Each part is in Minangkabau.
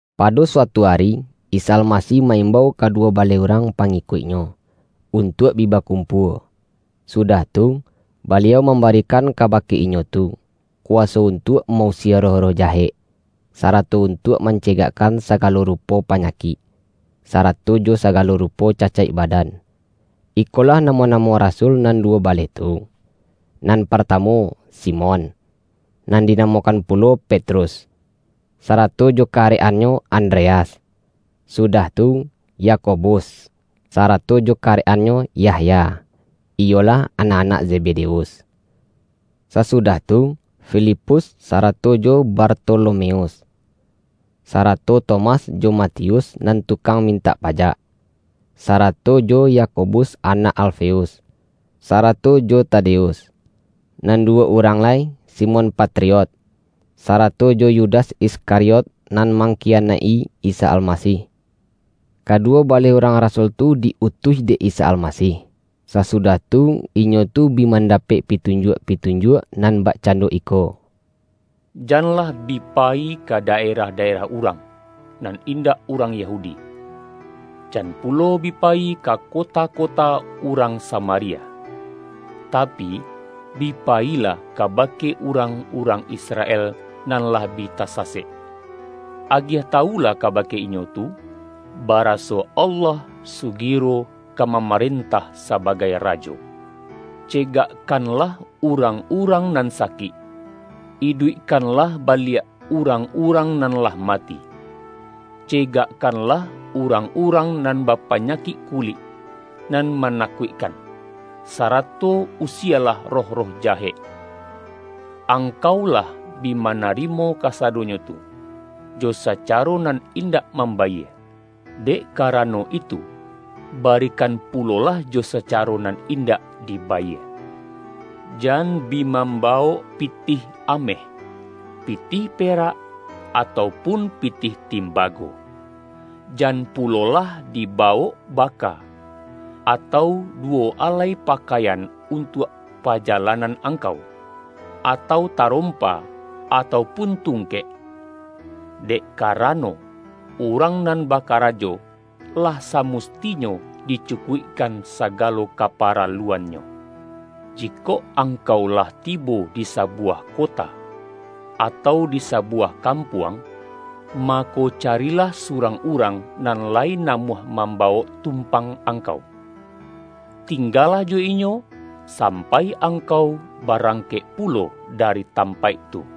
Pado suatu ari, Isa Almasih ma-imbau kaduwo baleh urang pangikuik-Nyo, untuak bi bakumpua. Sudah tu, Baliau mambarikan kaba-ke inyo tu, kuwaso untuak mausie roh-roh jahek, sarato untuak mance-gakkan sagalo rupo panyakik, sarato jo sagalo rupo cacaik badan. Ikolah namo-namo rasul nan duwo baleh tu: nan partamu, Simon, (nan dinamokan pulo Petrus,) sarato jo karek-annyo Andreas, sudah tu, Yakobus sarato jo karek-annyo Yahya, iyolah, anak-anak Zebedeus. Sasudah tu, Filipus sarato jo Bartolomeus, sarato Tomas jo Ma-tius nan tukang mintak pajak, sara-to jo Yakobus anak Alfeus, sarato jo Tadeus; Nan duwo urang lai, Simon Patriot, sarato jo Yudas Iskariot nan mangkiyanaik-i Isa Almasih. Kaduwo baleh urang rasul tu di-utuih dek Isa Almasih, sasudah tu inyo tu bi mandapek pitunjuak-pitunjuak nan bakcando iko,”Janlah bi payi ka daerah-daerah urang, nan indak urang Yahudi. Jan pulo bi payi ka kota-ko-ta urang Samaria. Tapi, bi payilah kabake urang-urang Israel, nan lah bi tasasek. Agiah tawulah kabake inyo tu, baraso Allah sugiro ka ma-marentah sabagai Rajo. Cegakkan-lah urang-urang nan sakik; iduikkan-lah baliak urang-urang nan lah mati; cegakkanlah urang-urang nan bapa-nyakik kulik nan manakuikkan, sa-rato usielah roh-roh jahek. Angkau lah bi manarimo kasadonyo tu, jo sa-caro nan indak mambayie. Dek kara-no itu, barikan pulolah jo sacaro nan indak dibayie. Jan bi mambawok pi-tih ameh, pitih perak, atau pun pitih timbago. Jan pulolah dibawok baka, atau duwo alai pakaian untuak paja-lanan angkau, atau tarompa, atau pun tungkek. Dek karano, urang nan ba-karajo, lah samustinyo dicukuikkan sagalo kaparaluannyo. Jikok angkau lah tibo di sabuwah kota, atau di sabuwah kampuang, mako, carilah surang urang, nan lai namuah mambawok tumpang angkau. Tingga-lah jo inyo, sampai angkau barangkek pulo dari tampaik tu.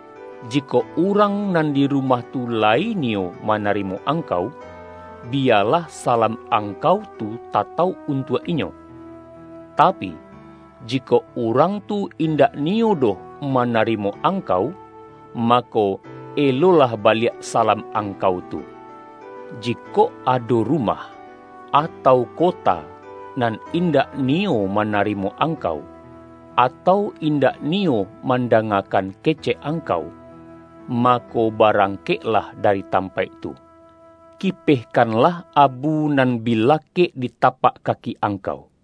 Jikok urang nan di rumah tu layi niyo manarimo angkau, biyalah salam angkau tu tatauk untuak inyo. Tapi, jikok urang tu indak niyo doh mana-rimo angkau, mako, elolah baliak sa-lam angkau tu. Jikok ado rumah, atau kota, nan indak niyo manarimo angkau, atau indak niyo mandanga-kan kecek angkau, mako, barangkek-lah dari tampaik tu, kipehkanlah abu nan bi lakek di tapak kaki angkau.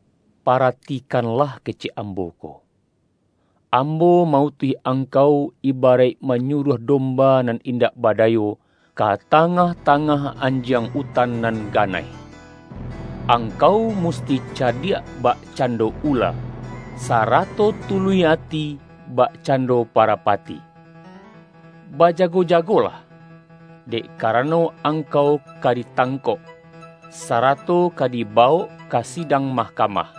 ”Paratikanlah kecek Ambo ko: Ambo ma-utuih angkau, ibaraik ma-nyuruah domba nan indak badayo, ka tangah-tangah anjiang utan nan ga-naih. Angkau musti cadiak bakcando ula, sarato tuluih ati bakcando parapa-ti. Bajago-jagolah, dek karano ang-kau ka ditangkok, sarato ka dibawok ka sidang mahkamah.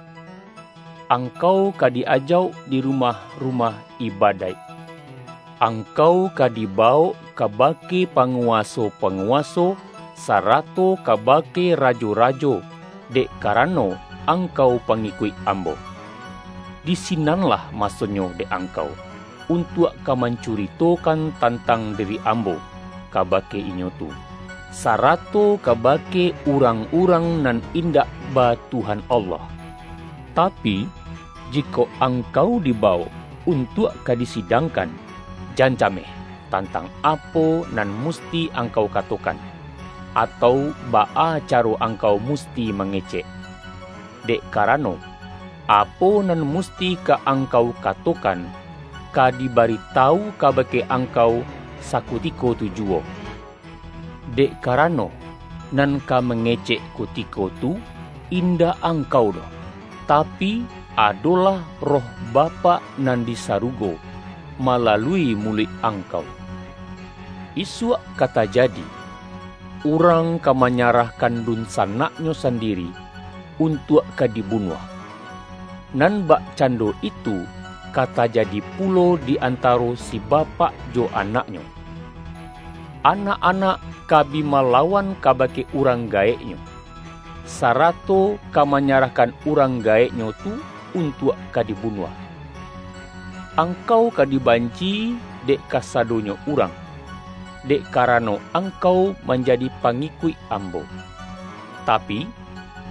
Angkau ka di-ajauk di rumah-rumah ibadaik. Ang-kau ka dibawok kabake panguwaso-pa-nguwaso, sarato kabake rajo-rajo, dek karano angkau pangikuik Ambo. Di si-nanlah masonyo dek angkau, untuak ka mancuritokan tantang diri Ambo, kabake inyo tu, sarato kabake urang-urang nan indak ba Tuhan Allah. Ta-pi, jikok angkau dibawok untuak ka di-sidangkan, jan cameh tantang apo nan musti angkau katokan, atau baa caro angkau musti mangecek. Dek karano, apo nan musti ka angkau katokan, ka dibaritawu kabake angkau sakutiko tu juwo. Dek karano, nan ka mange-cek kutiko tu, indak angkau doh, ta-pi, adolah Roh Bapak nan di sarugo, malalui muluik angkau. Isuak ka tajadi, urang ka manya-rahkan dunsanaknyo sandiri, untuak ka dibunuah. Nan bakcando itu ka ta-jadi pulo di antaro si bapak jo anak-nyo. Anak-anak ka bi malawan kabake urang gaeknyo, sarato ka manyarahkan urang gaeknyo tu untuak ka di-bunuah. Angkau ka dibanci-i dek kasadonyo urang, dek karano angkau manjadi pangikuik Ambo. Tapi,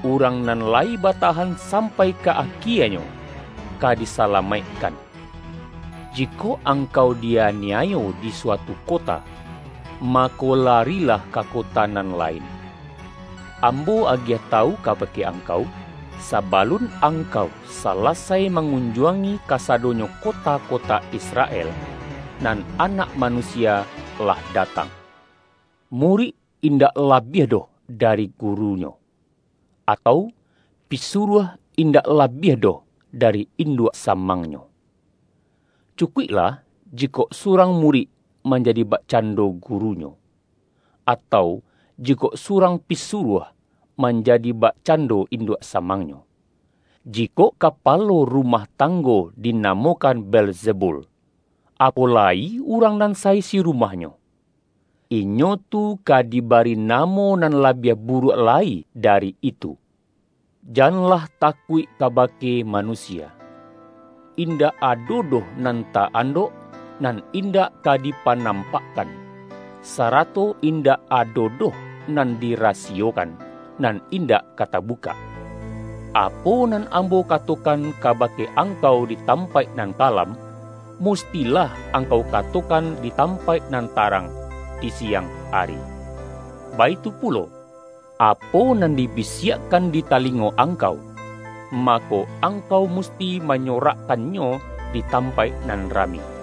urang nan lai batahan sampai ka akienyo, ka disalamaikkan. Jikok angkau di-ani-ayo di suatu kota, mako larilah ka ko-ta nan lain. Ambo agiah tawu kabake angkau: Sabalun angkau salasai ma-ngunjuangi kasadonyo kota-kota Israel, nan Anak Manusia lah datang. Murik indak labiah doh dari guru-nyo, atau, pisuruah indak labiah doh dari induak samangnyo. Cukuiklah jikok surang murik manjadi bakcando gurunyo, atau, jikok surang pisuruah manjadi bakcando induak samangnyo. Jikok kapalo rumah tanggo dinamo-kan Beelzebul, apo lai urang nan sa-isi rumahnyo. Inyo tu ka dibari namo nan labiah buruak lai dari itu!” ”Janlah takuik kabake manusia. Indak ado doh nan ta-andok, nan in-dak ka dipanampakkan, sarato indak ado doh nan dirasiyokan, nan indak ka tabukak. Apo nan Ambo katokan kabake angkau di tampaik nan kalam, mustilah angkau katokan di tampaik nan tarang, di siang ari. Baitu pulo, apo nan dibisiakkan di talingo ang-kau, mako, angkau musti manyorak-kannyo di tampaik nan rami!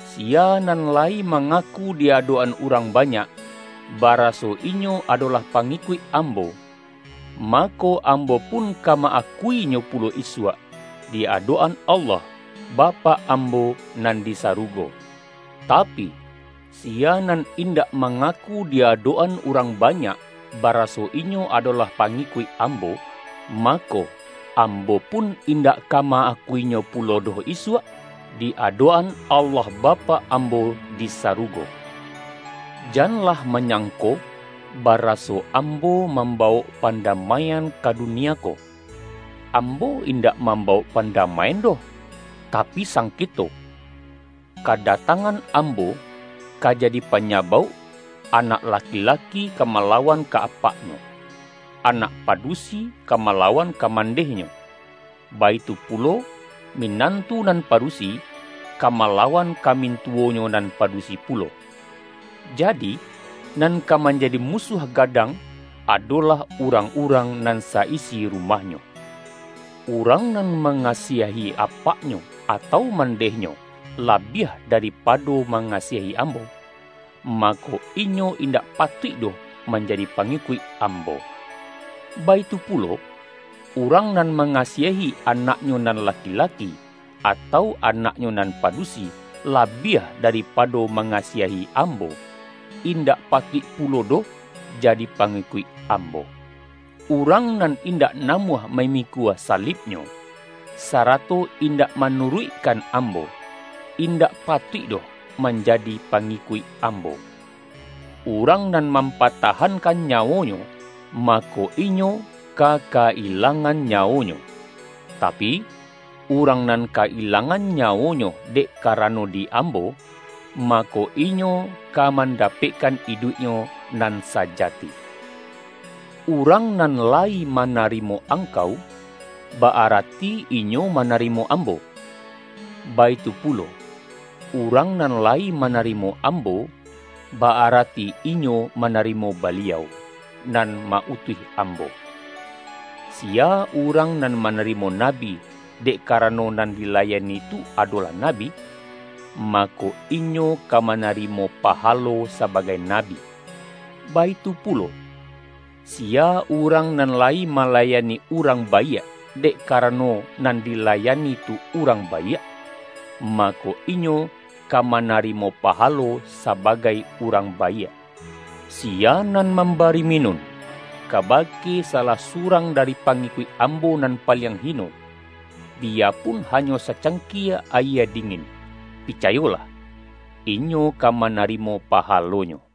”Siya nan lai mangaku di adok-an urang banyak, baraso inyo adolah pangikuik Ambo, mako, Ambo pun ka ma-akuinyo pulo isuak, di adok-an Allah Bapak Ambo nan di sarugo. Tapi, siya nan indak mangaku di adok-an urang banyak, baraso inyo adolah pangikuik Ambo, mako, Ambo pun indak ka ma-akuinyo pulo doh isuak, di adok-an Allah Bapak Ambo di sarugo.” ”Janlah manyangko baraso Ambo mambawok padamaian ka dunia ko. Ambo indak mambawok padamaian doh, tapi sangketo. Kadatangan Am-bo, ka jadi panyabauk, anak laki-laki ka malawan ka apaknyo, anak padu-si ka malawan ka mandehnyo, baitu pulo, minantu nan padusi, ka mala-wan ka mintuwonyo nan padusi pu-lo. Jadi, nan ka manjadi musuah gadang, adolah urang-urang nan sa-isi rumahnyo. Urang nan mangasiahi apaknyo, atau mandehnyo, labiah daripado ma-ngasiahi Ambo, mako, inyo indak pa-tuik doh manjadi pangikuik Ambo. Baitu pulo, urang nan mangasiahi anaknyo nan laki-laki, atau anaknyo nan padusi, labiah daripado manga-siahi Ambo, indak patuik pulo doh jadi pangikuik ambo. Urang nan indak namuah mamikua salibnyo, sarato in-dak manuruikkan Ambo, indak patuik doh manjadi pangikuik Ambo. Urang nan mampatahankan nyawonyo, ma-ko, inyo ka ka-ilangan nyawonyo, tapi, urang nan ka-ilangan nyawonyo, dek karano di Ambo, mako, inyo ka man-dapekkan iduiknyo nan sajati.” ”Urang nan layi manarimo ang-kau, ba-arati inyo manarimo Ambo. Baitu pulo, urang nan layi manari-mo Ambo, ba-arati inyo manarimo Baliau, nan ma-utuih Ambo. Siya urang nan manarimo nabi, dek kara-no nan dilayani tu adolah nabi, mako, inyo ka manarimo pahalo sabagai na-bi. Baitu pulo, siya urang nan lai ma-layani urang baiak, dek karano nan dilayani tu urang baiak, mako, inyo ka manarimo pahalo sabagai urang baiak. Siya nan mambari minun, kabake salah surang dari pangikuik Ambo nan paliang hino, biyapun ha-nyo sacangkie ayie dingin, picayolah, inyo ka manarimo pahalonyo!”